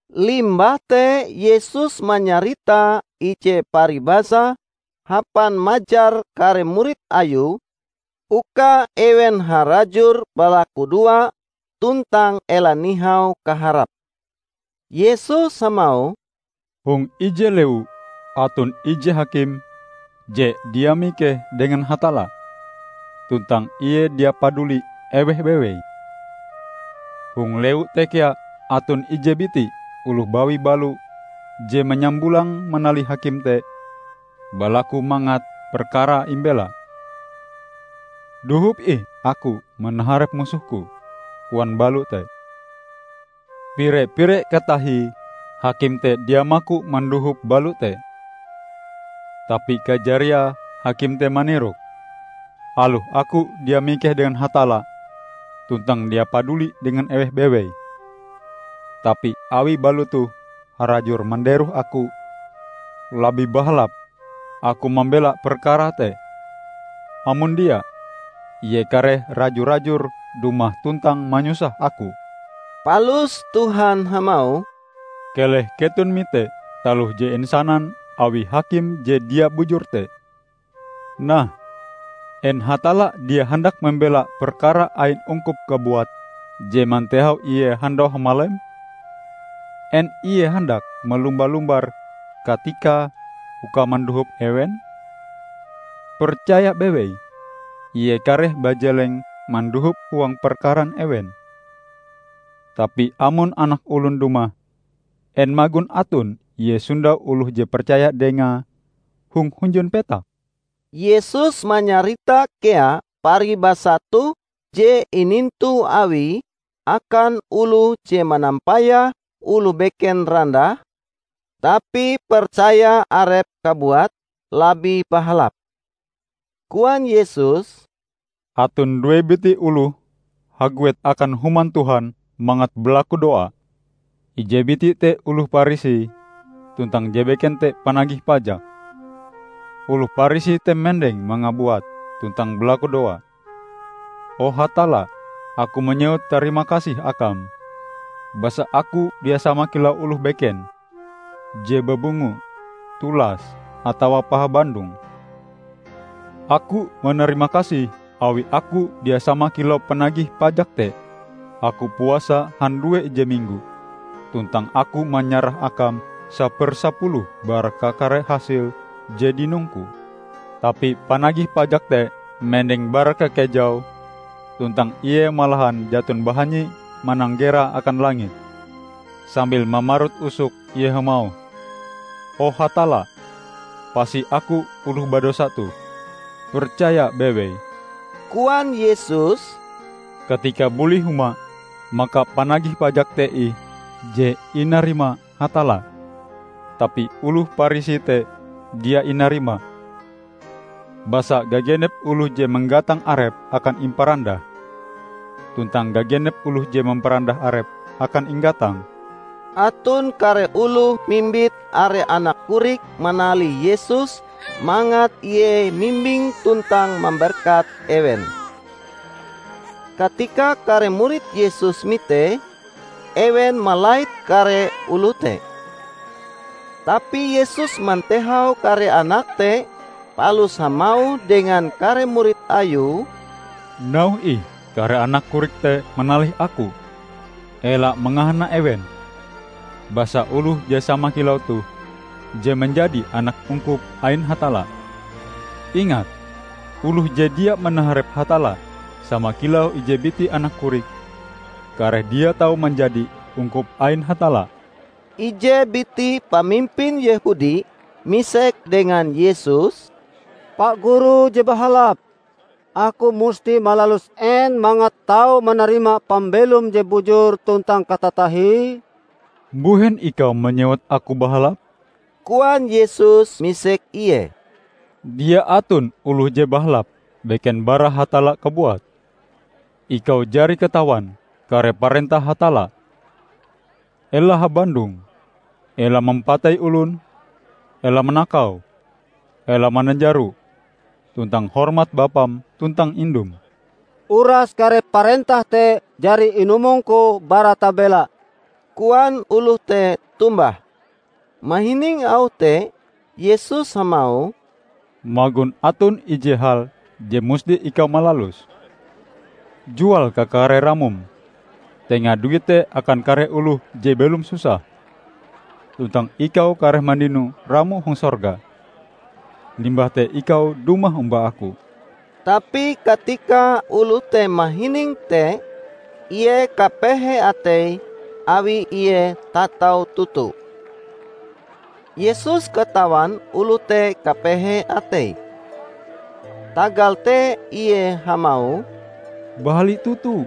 Limbah te Yesus manyarita ije paribasa hapan majar kare murid Ayue uka ewen harajur balakudoa tuntang ela nihau kaharape. Yesus hamauh, "Hong ije lewu aton ije hakim je dia mikeh dengan Hatalla, tuntang ie dia paduli eweh bewei. Hong lewu te kea aton ije biti oloh bawi balo je manyambulang manalih hakim te balaku mangat perkarae imbela. 'Dohop ih aku manaharep musohku,' koan balo te. Pire-pire katahie hakim te dia maku mandohop balo te. Tapi kajariae hakim te manirok, 'Aloh aku dia mikeh dengan Hatalla, tuntang dia paduli dengan eweh bewei, tapi awi balo toh harajur manderoh aku, labih bahalap aku mambela perkarae te. Amon dia, ie kareh raju-rajur dumah tuntang manyusah aku.' " Palus Tuhan hamauh, "Keleh keton mite taloh je insanan awi hakim je dia bujur te! Nah, en Hatalla dia handak mambela perkara ain ungkupe kabuat je mantehau Ie handau hamalem? En Ie handak malumba-lumbar katikae uka mandohop ewen? Percaya bewei: ie kareh bajeleng mandohop huang perkaran ewen! Tapi amon Anak Olon dumah, en magon aton Ie sondau oloh je percaya Dengae hong hunjun petak?" Yesus manyarita kea paribasa toh je inintu Awie akan oloh je manampayah oloh beken randah, tapi percaya arepe kabuat labih bahalap. Koan Yesus, "Aton due biti oloh haguet akan Human Tuhan mangat balakudoa. Ije biti te oloh Parisi, tuntang je beken te panagih pajak. Oloh Parisi te mendeng mangabuat tuntang balakudoa, 'O Hatalla, aku manyewut tarimakasih Akam, basa aku dia sama kilau oloh beken, je babungo, tulas, atawa pahabandong. Aku manarima kasih awi aku dia sama kilau panagih pajak te. Aku puasa handue ije minggo, tuntang aku manyarah Akam sapersapuluh bara kakare hasil je dinongku.' Tapi panagih pajak te mendeng bara kakejau tuntang ie malahan jaton bahanyi mananggera akan langit. Sambil mamarut usoke ie hamauh, 'O Hatalla, pasi aku oloh badosa toh!' " "Percaya bewei," koan Yesus, "katika buli huma, maka panagih pajak te ih je inarima Hatalla tapi oloh Parisi te dia inarima. Basa gagenep oloh je manggatang arepe akan imparandah; tuntang gagenep oloh je mamparandah arepe akan inggatang." Aton kare oloh mimbit are anak korik manalih Yesus mangat ie mimbing tuntang mamberkat ewen. Katika kare murid Yesus mitee, ewen malait kare oloh te. Tapi Yesus mantehau kare anak te palus hamauh dengan kare murid Ayue, "Nauhe ih kare anak korik te manalih Aku! Ela mangahana ewen, basa oloh je sama kilau toh je manjadi anak ungkup ain Hatalla. Ingat! Oloh je dia manaharep Hatalla sama kilau ije biti anak korik, kareh dia tau manjadi ungkup ain Hatalla." Ije biti pamimpin Yehudi misek dengan Yesus, "Pa Guru je bahalap, aku musti malalus en mangat tau manarima pambelom je bujur tuntang katatahie?" "Mbuhen ikau manyewut Aku bahalap?" koan Yesus misek ie. "Dia aton oloh je bahalap, beken bara Hatalla kabuat. Ikau jari katawan kare parentah Hatalla: 'Ela habandong, ela mampatei olon, ela manakau, ela mananjaro, tuntang hormat bapam tuntang indum.' " "Uras kare parentah te jari inumongku bara tabela," koan oloh te tombah. Mahining auh te Yesus hamauh, "Magon aton ije hal je musti ikau malaluse: Jual kakare ramom, tenga duite akan kare oloh je belom susah, tuntang ikau kareh mandino ramo hong sorga. Limbah te ikau dumah omba Aku." Tapi katika oloh te mahining te, ie kapehe ateie awi ie tatau toto. Yesus katawan oloh te kapehe ateie. Tagal te ie hamauh, "Bahali toto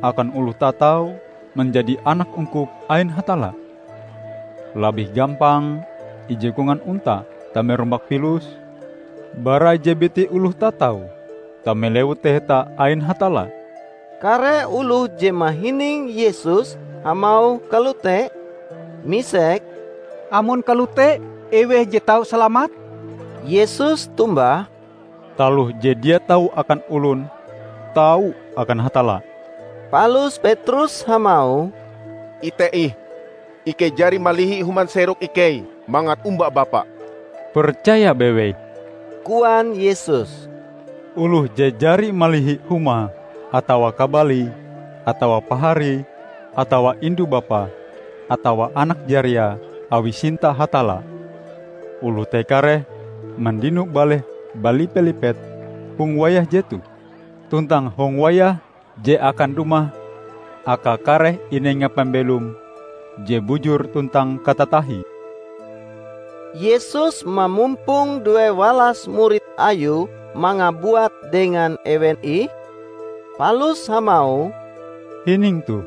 akan oloh tatau manjadi anak ungkup ain Hatalla! Labih gampang ije kongan onta tame rumbak pilus, bara ije biti oloh tatau tame Lewu Taheta ain Hatalla." Kare oloh je mahining Yesus hamauh kalote, misek, "Amon kalote, eweh je tau salamat?" Yesus tombah, "Taloh je dia tau akan olon, tau akan Hatalla!" Palus Petrus hamauh, "Ite ih! Ikei jari malihi huma serok ikei mangat omba Bapa." "Percaya bewei!" koan Yesus. "Oloh je jari malihi humae atawa kabalie, atawa paharie atawa indu bapae atawa anak jariae awie sinta Hatalla, oloh te kareh mandino baleh balipe-lipet hong wayah jetoh, tuntang hong wayah je akan dumah akae kareh inenga pambelom je bujur tuntang katatahie." Yesus mamumpong duewalas murid Ayue mangabuat dengan ewen ih, palus hamauh, "Hining toh!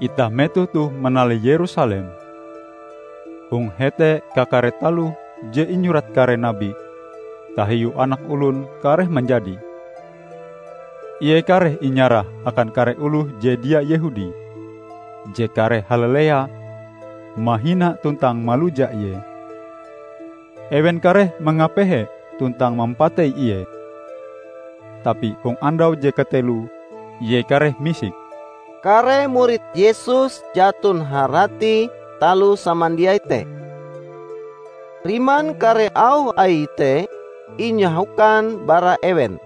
Itah metoh toh manalih Yerusalem. Hong hete kakare taloh je inyurat kare nabi tahiu Anak Olon, kareh manjadi. Ie kareh inyarah akan kare oloh je dia Yehudi, je kareh halalea, mahina, tuntang maluja Ie. Ewen kareh mangapehe tuntang mampatei Ie, tapi hong andau je kateloe Ie kareh misik." Kare murid Yesus jaton harati taloh samandiai te. Riman kare auh Aie te inyahokan bara ewen.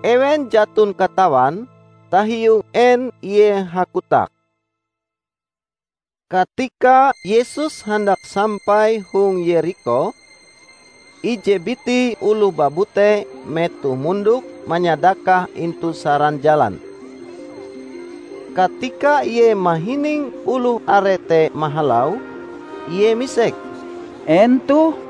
Ewen jaton katawan, tahiu en Ie hakotak. Katika Yesus handak sampai hong Yerikho, ije biti oloh babute metoh mondok manyadakah intu saran jalan. Katika ie mahining oloh are te mahalau, ie misek, "En toh?"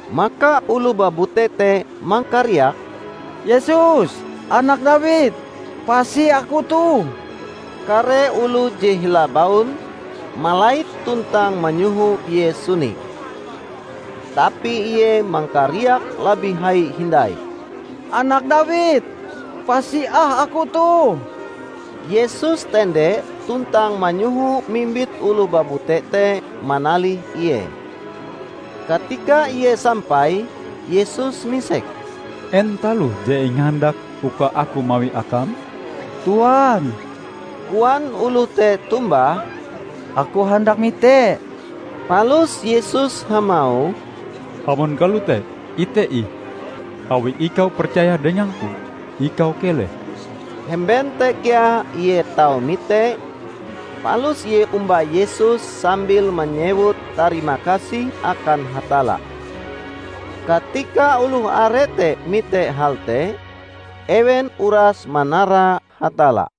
Maka oloh babute te mangkariak, "Yesus, anak Dawid! Pasi aku toh!" Kare oloh je hila baun, malait tuntang manyoho ie suni. Tapi ie mangkariak labih hai hindai, "Anak Dawid! Pasi ah aku toh!" Yesus tende tuntang manyoho mimbit oloh babute te manalih Ie. Katika ie sampai, Yesus misek, "En taloh je ingahandakm uka Aku mawie akam?" "Tuan," koan oloh te tombah, "aku handak mite." Palus Yesus hamauh, "Amon kalote, ite ih! Awi ikau percaya dengang-Ku, ikau keleh." Hemben te kea ie tau mite, palus ie omba Yesus sambil manyewut tarimakasih akan Hatalla. Katika oloh are te mite hal te, ewen uras manara Hatalla.